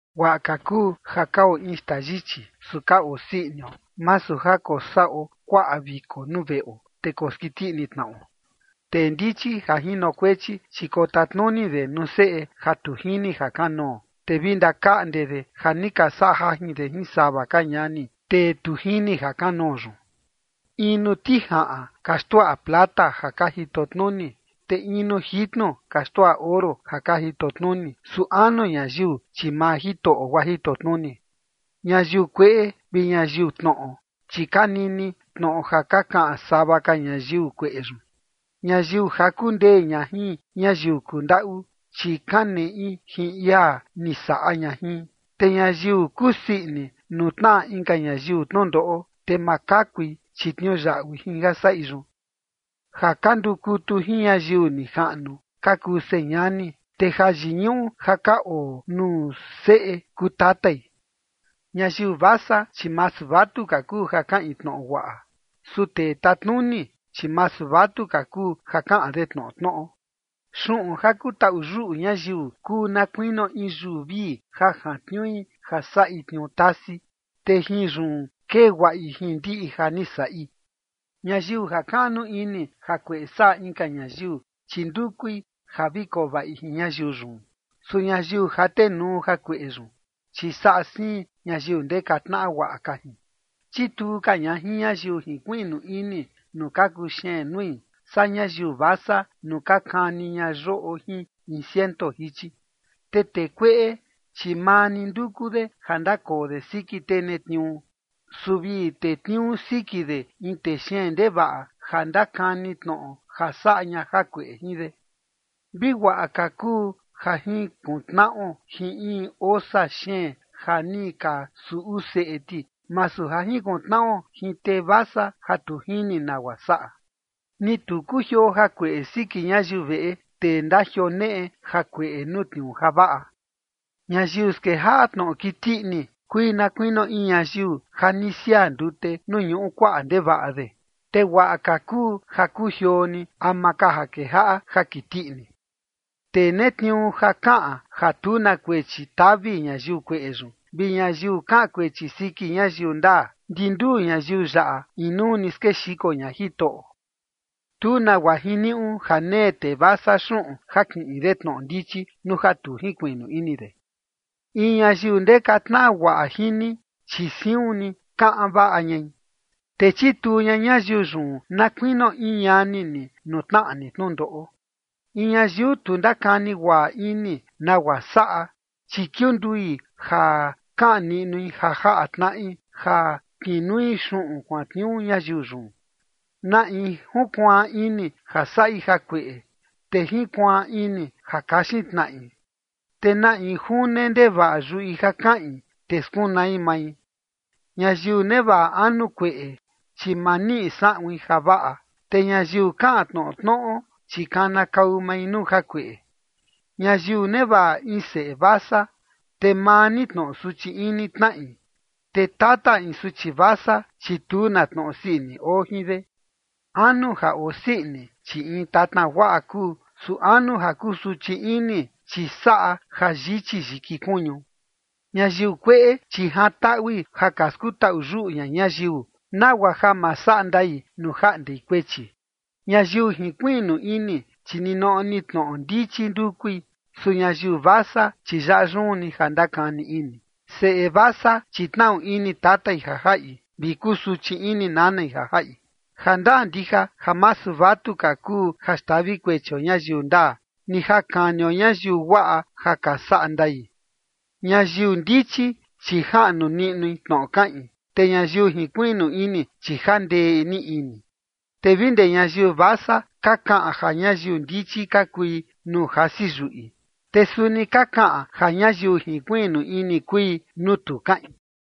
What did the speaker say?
Guaꞌa ka kuu ja kao in xtaa yichi, su ka osii inio, masu ja kosaꞌo kuaꞌa viko nuu veꞌo, te koskiti tnaꞌo. Tee ndichi ja jinokuechi, chi kotatnuni de nuu seꞌe ja tu jini jakanoo, te vi ndakaꞌnde de ja ni ka saꞌa jajin de jin sava ka ñani, tee tu jini jakanoo yun. In nuu tijaꞌan ka xtuaꞌa plata ja ka jito tnuni, te in nuu jitnu ka xtuaꞌa oro ja ka jito tnuni. Su anu ñayiu, chi maa Jitoꞌo guaa jito tnuni. Ñayiu kueꞌe vi ñayiu tnoꞌo, chi ka nini tnoꞌo ja ka kaꞌan sava ka ñayiu kueꞌe yun. Ñayiu jaku ndee ña jin ñayiu kundaꞌu, chi kaneꞌi jin ia ni saꞌa ña jin. Te ñayiu kusii ini nuu tnaꞌa inka ñayiu tnundoꞌo, te ma kakui, chi tniuyaꞌui jin ja saꞌi yun. Ja ka ndukutu jin ñayiu nijaꞌnu ka kuu señani, te jayiñuꞌu ja ka oo nuu seꞌe kuu tatai. Ñayiu vasa, chi masu vatuka kuu ja kaꞌin tnoꞌo guaꞌa. Su tee tatnuni, chi masu vatuka kuu ja kaꞌan de tnoꞌo tnoꞌo. Xuꞌun ja kutaꞌu yuꞌu ñayiu kuu na kuinio in yuu vii ja jantniui ja saꞌi tniuu tasi, te jin yun kee guaꞌi jin ndiꞌi ni ja saꞌi. Ñayiu jakaꞌnu ini jakueꞌe saꞌa inka ñayiu, chi ndukui ja vi koo vaꞌi jin ñayiu yun. Su ñayiu jatenuu jakueꞌe yun, chi saꞌa siin ñayiu ndeka tnaꞌa guaꞌa ka jin. Chituu ka ña jin ñayiu jinkuiꞌnu ini nuu ka kuxeen nui, saa ñayiu vasa nuu ka kani ña yoꞌo jin in ciento jichi. Te tee kueꞌe, chi maa ni nduku de ja ndakoo de siki tee netniuu. Su vi tetniuu siki de in tee xeen ndevaꞌa ja ndakani tnoꞌo ja saꞌa ña jakueꞌe jin de. Vi guaꞌa ka kuu ja jinkuntnaꞌo jin in osa xeen ja ni ka suꞌu seꞌe ti, masu ja jinkuntnaꞌo jin tee vasa ja tu jini nagua saꞌa. Ni tu kujioo jakueꞌe siki ñayiu veꞌe tee ndajioneꞌe jakueꞌe nuu tniuu javaꞌa. Ñayiu skejaꞌa tnoꞌo kiti ini kui na kuinio in ñayiu ja ni siaa ndute nuu ñuꞌu kuaꞌa ndevaꞌa de, te guaꞌa ka kuu ja kujioo ni ama ka ja kejaꞌa ja kiti ini. Tee netniuu ja kaꞌan ja tu na kuechi tavi ñayiu kueꞌe yun, vi ñayiu kaꞌan kuechi siki ñayiu ndaa, ndi nduu ñayiu yaꞌa inuu ni skexiko ña Jitoꞌo. Tu nagua jiniuꞌu ja nee tee vasa xuꞌun ja kiꞌin de tnoꞌo ndichi nuu ja tu jinkuiꞌnu ini de. In ñayiu ndeka tnaꞌa guaꞌa jin ni, chi siun ni kaꞌan vaꞌa ñai, te chituu ña ñayiu yun na kuinio in ñani ni nuu tnaꞌa ni tnundoꞌo. In ñayiu tu ndakani guaꞌa ini nagua saꞌa, chi kiundui ja kaꞌan niꞌnui ja jaꞌa tnaꞌi ja kinui xuꞌun kuantniuu ñayiu yun. Na in junkuaan ini ja saꞌi jakueꞌe, te jinkuaan ini ja kaxin tnaꞌi. Te na in june ndevaꞌa yuꞌi ja kaꞌin, te skunai mai. Ñayiu nevaꞌa anu kueꞌe, chi ma niꞌi saꞌuin javaꞌa, te ñayiu kaꞌan tnoꞌo tnoꞌo, chi kanakau mai nuu jakueꞌe. Ñayiu nevaꞌa in seꞌe vasa, te maa ni tnoꞌo suchi ini tnaꞌi, te tata in suchi vasa, chi tu na tnoꞌo sii ini oo jin de. Anu ja osii ini, chi in tatna guaꞌa kuu, su anu ja kusuchi ini, chi saꞌa ja yichi yiki kuñu. Ñayiu kueꞌe, chi jantaꞌui ja ka skutaꞌu yuꞌu ña ñayiu, nagua ja ma saꞌa ndai nuu jaꞌndei kuechi. Ñayiu jinkuiꞌnu ini, chi ninoꞌo ni tnoꞌo ndichi ndukui. Su ñayiu vasa, chi yaꞌa yun ni ja ndakani ini. Seꞌe vasa, chi tnaꞌu ini tatai ja jaꞌi, vi kusuchi ini nanai ja jaꞌi. Jandaa ndija ja masu vatuka kuu ja xtavi kuechio ñayiu ndaa, ni ja kanio ñayiu guaꞌa ja ka saꞌa ndai. Ñayiu ndichi, chi jaꞌnu niꞌnui tnoꞌo kaꞌin, te ñayiu jinkuiꞌnu ini, chi jandee ni ini. Te vi ndee ñayiu vasa ka kaꞌan ja ñayiu ndichi ka kui nuu jasi yuꞌi, te suni ka kaꞌan ja ñayiu jinkuiꞌnu ini kui nuu tu kaꞌin.